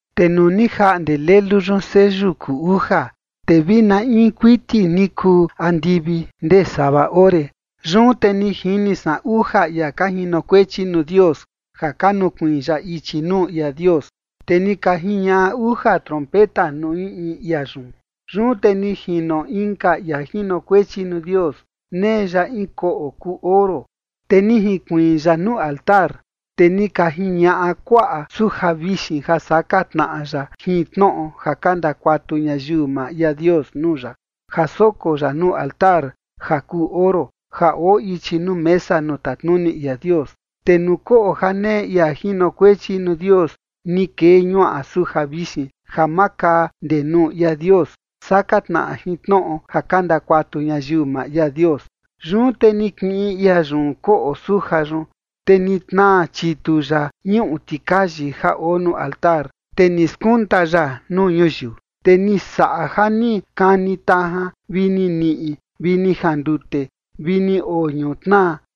Te nuu ni jaꞌnde Lelu yun seyu kuu uja, te vi na in kuiti ni kuu andivi ndee sava ore. Yun te ni jini san uja ia ka jinokuechi nuu Dios ja ka nukuiin ya ichi nuu ia Dios, te ni ka jiñaꞌa uja trompeta nuu in in ia yun. Yun te ni jino inka ia jinokuechi nuu Dios, nee ya in koꞌo kuu oro, te ni jinkuiin ya nuu altar. Te ni ka jiñaꞌa kuaꞌa suja vixin ja saka tnaꞌa ya jin tnoꞌo ja ka ndakuatu ñayiu maa ia Dios nuu ya, ja soko ya nuu altar ja kuu oro, ja oo ichi nuu mesa nuu tatnuni ia Dios. Te nuu koꞌo ja nee ia jinokuechi nuu Dios, ni kee ñuaꞌa suja vixin ja makaa ndee nuu ia Dios, saka tnaꞌa jin tnoꞌo ja ka ndakuatu ñayiu maa ia Dios. Yun te ni kiꞌin ia yun koꞌo suja yun, te ni tnaa chitu ya ñuꞌu tikayi ja oo nuu altar, te ni skunta ya nuu ñuyiu. Te ni saꞌa ja ni kani tajan vi ni niꞌi vi ni jandute vi ni oo ñutnaa.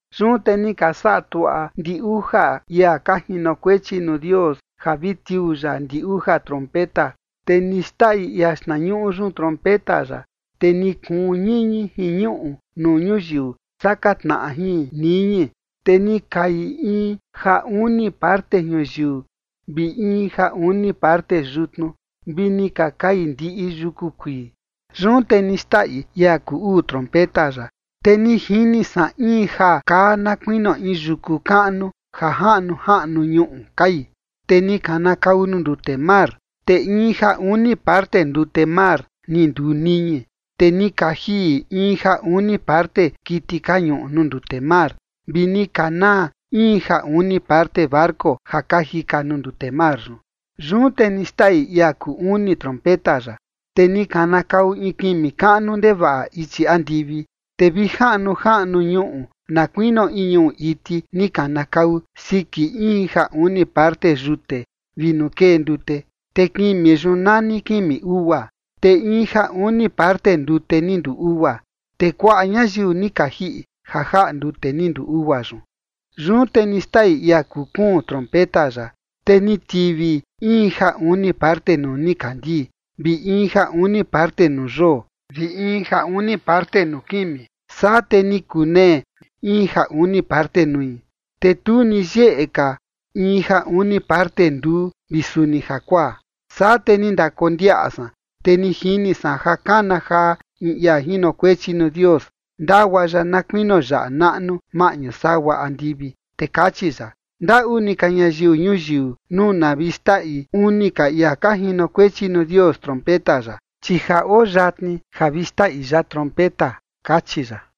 Yun te ni ka saꞌa tuaꞌa ndi uja ia ka jinokuechi nuu Dios ja vi tiuu ya ndi uja trompeta. Te ni xndaꞌi ia xtnañuꞌu yun trompeta ya. Te ni kuun ñiñi jin ñuꞌu nuu ñuyiu saka tnaꞌa jin niñi. Te ni kai in ja uni parte ñuyiu vi in ja uni parte yutnu, vi ni ka kai ndiꞌi yuku kuii. Yun te ni xndaꞌi ia kuu uu trompeta ya. Te ni jini san in ja kaa na kuinio in yuku kaꞌnu ja jaꞌnu jaꞌnu ñuꞌu kai, te ni kanakau nuu ndute mar, te in ja uni parte ndute mar ni nduu niñi. Te ni ka jiꞌi in ja uni parte kiti ka ñuꞌu nuu ndute mar, vi ni ka naa in ja uni parte barco ja ka jika nuu ndute mar yun. Yun te ni xndaꞌi ia kuu uni trompeta ya. Te ni kanakau in kimi kaꞌnu ndevaꞌa ichi andivi, te vi jaꞌnu jaꞌnu ñuꞌu na kuinio in ñuꞌu iti ni kanakau siki in ja uni parte yute vi nuu kee ndute. Te kimi yun nani kimi ugua. Te in ja uni parte ndute ni nduu ugua, te kuaꞌa ñayiu ni ka jiꞌi ja jaꞌa ndute ni nduu ugua yun. Yun te ni xndaꞌi ia kuu kuun trompeta ya. Te ni tivi in ja uni parte nuu nikandii, vi in ja uni parte nuu yoo, vi in ja uni parte nuu kimi, saa te ni kunee in ja uni parte nui, te tu ni yeꞌe ka in ja uni parte nduu vi suni jakuaa. Saa te ni ndakondiaꞌa san, te ni jini san ja kana jaa in ia jinokuechi nuu Dios, ndagua ya na kuinio yaꞌa naꞌnu, maꞌñu sagua andivi, te kachi ya: ―Ndaꞌu ni ka ñayiu ñuyiu nuu na vi xndaꞌi uni ka ia ka jinokuechi nuu Dios trompeta ya, chi ja oo yatni ja vi xtaꞌi ya trompeta ―kachi ya.